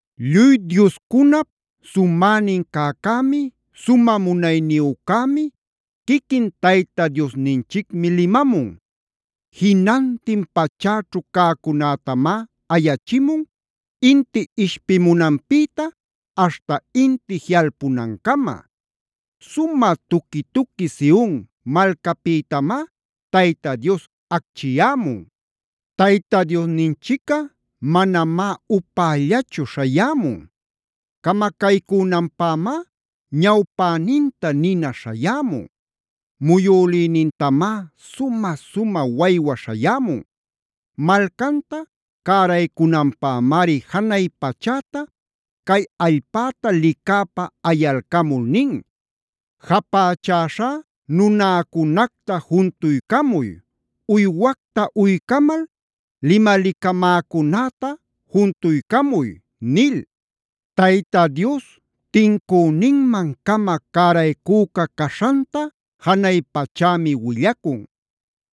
Lluy dioscunap sumänin cäcämi, sumä munayniyücämi, quiquin Tayta Diosninchicmi limamun. Jinantin pachäćhu cäcunätamá ayachimun, inti ishpimunanpïta aśhta inti jiꞌalpunancama. Sumä tuqui-tuqui Sion malcapïtamá Tayta Dios acchiyämun. Tayta Diosninchicꞌa manamá upällachu śhayämun. Camacaycünanpämá ñawpäninta nina śhayämun. Muyülïnintamá sumä-sumä waywa śhayämun. Malcanta cäraycunanpämari janay pachäta cay allpäta licäpa ayalcamul nin: “Japächäśhá nunäcunacta juntuycamuy. Uywacta uycamal limalicamäcunäta juntuycamuy” nil. Tayta Dios tincüninman-cama cäraycüca caśhanta janay pachämi willacun.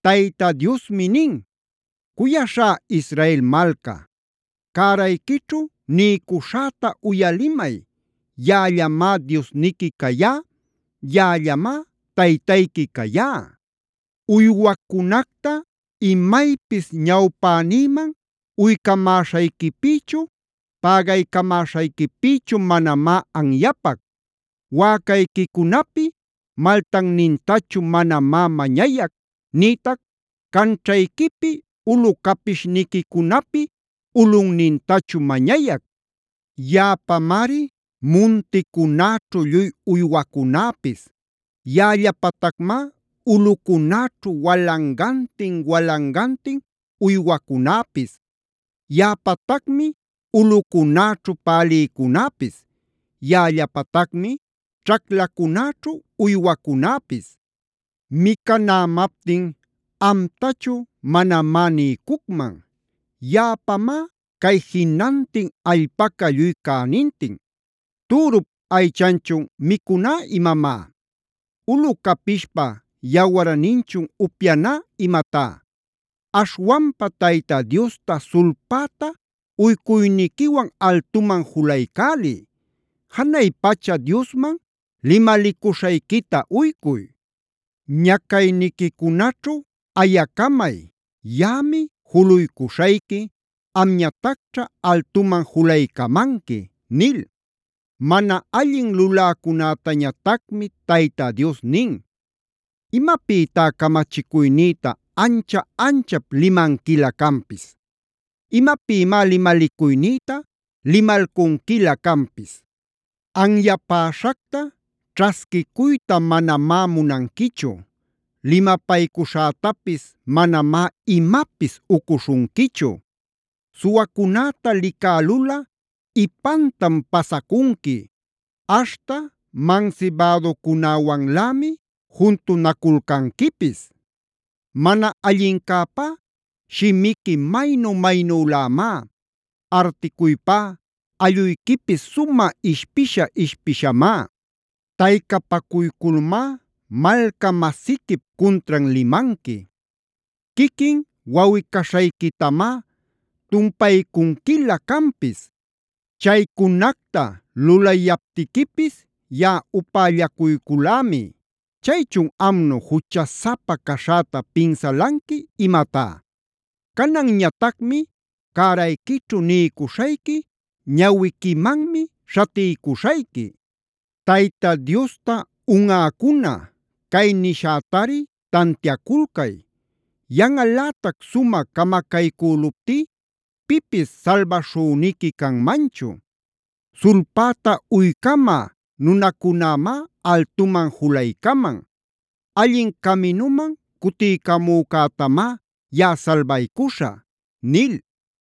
Tayta Diosmi nin: “Cuyaśhá Israel malca, cärayquićhu niycuśhäta uyalimay. Yaꞌallamá Diosniqui cayá. Yaꞌallamá Taytayqui cayá. Uywacunacta imaypis ñawpänïman uycamäśhayquipïchu, pägaycamäśhayquipïchu manamá anyapac. Wäcayquicunapi maltannintachu manamá mañayac, nïtac canćhayquipi ulu capishniquicunapi ulunnintachu mañayac. Yaꞌapamari munticunäćhu lluy uywacunäpis. Yaꞌallapatacmá ulꞌucunäćhu walangantin-walangantin uywacunäpis. Yaꞌapatacmi ulꞌucunäćhu pälïcunäpis. Yaꞌallapatacmi ćhaclacunäćhu uywacunäpis. Micanämaptin amtachu manamá niycucman. Yaꞌapamá cay jinantin allpaca lluy cänintin. ¿Türup aychanchun micuná imamá? ¿Ulu capishpa yawarninchun upyaná imatá? Aśhwanpa Tayta Diosta sulpäta uycuyniquiwan altuman julaycäliy. Janay pacha Diosman limalicuśhayquita uycuy. Ñacayniquicunaćhu ayacamay. Yaꞌami juluycuśhayqui, amñatacćha altuman julaycamanqui” nil. Mana allin luläcunätañatacmi Tayta Dios nin: “¿Imapïtá camachicuynïta ancha-anchap limanquilä canpis? ¿Imapïmá limalicuynïta limalcunquilä canpis? Anyapäśhacta ćhasquicuyta manamá munanquichu. Limapaycuśhätapis manamá imapis ucuśhunquichu. Suwacunäta licälulꞌa ipantam pasacunqui. Aśhta mansibäducunäwanlämi juntunaculcanquipis. Mana allincäpá shimiqui maynu-maynülämá. Articuypá alluyquipis sumä ishpisha-ishpishamá. Taycapacuyculmá malca-masiquip cuntran limanqui. Quiquin wawꞌi-caśhayquitamá tumpaycunquilä canpis. Chaycunacta lulayaptiquipis yaꞌa upällacuyculämi. Chaychun ¿amnu juchasapa caśhäta pinsalanqui, imatá? Cananñatacmi cärayquićhu niycuśhayqui, ñawiquimanmi śhatiycuśhayqui. Tayta Diosta unꞌäcuna, cay nishätari tantiaculcay. Yanꞌalätac sumä camacaycüluptí pipis salbaśhüniqui canmanchu. Sulpäta uycamä nunacunämá altuman julaycaman. Allin caminuman cutiycamücätamá yaꞌa salbaycuśhä” nil.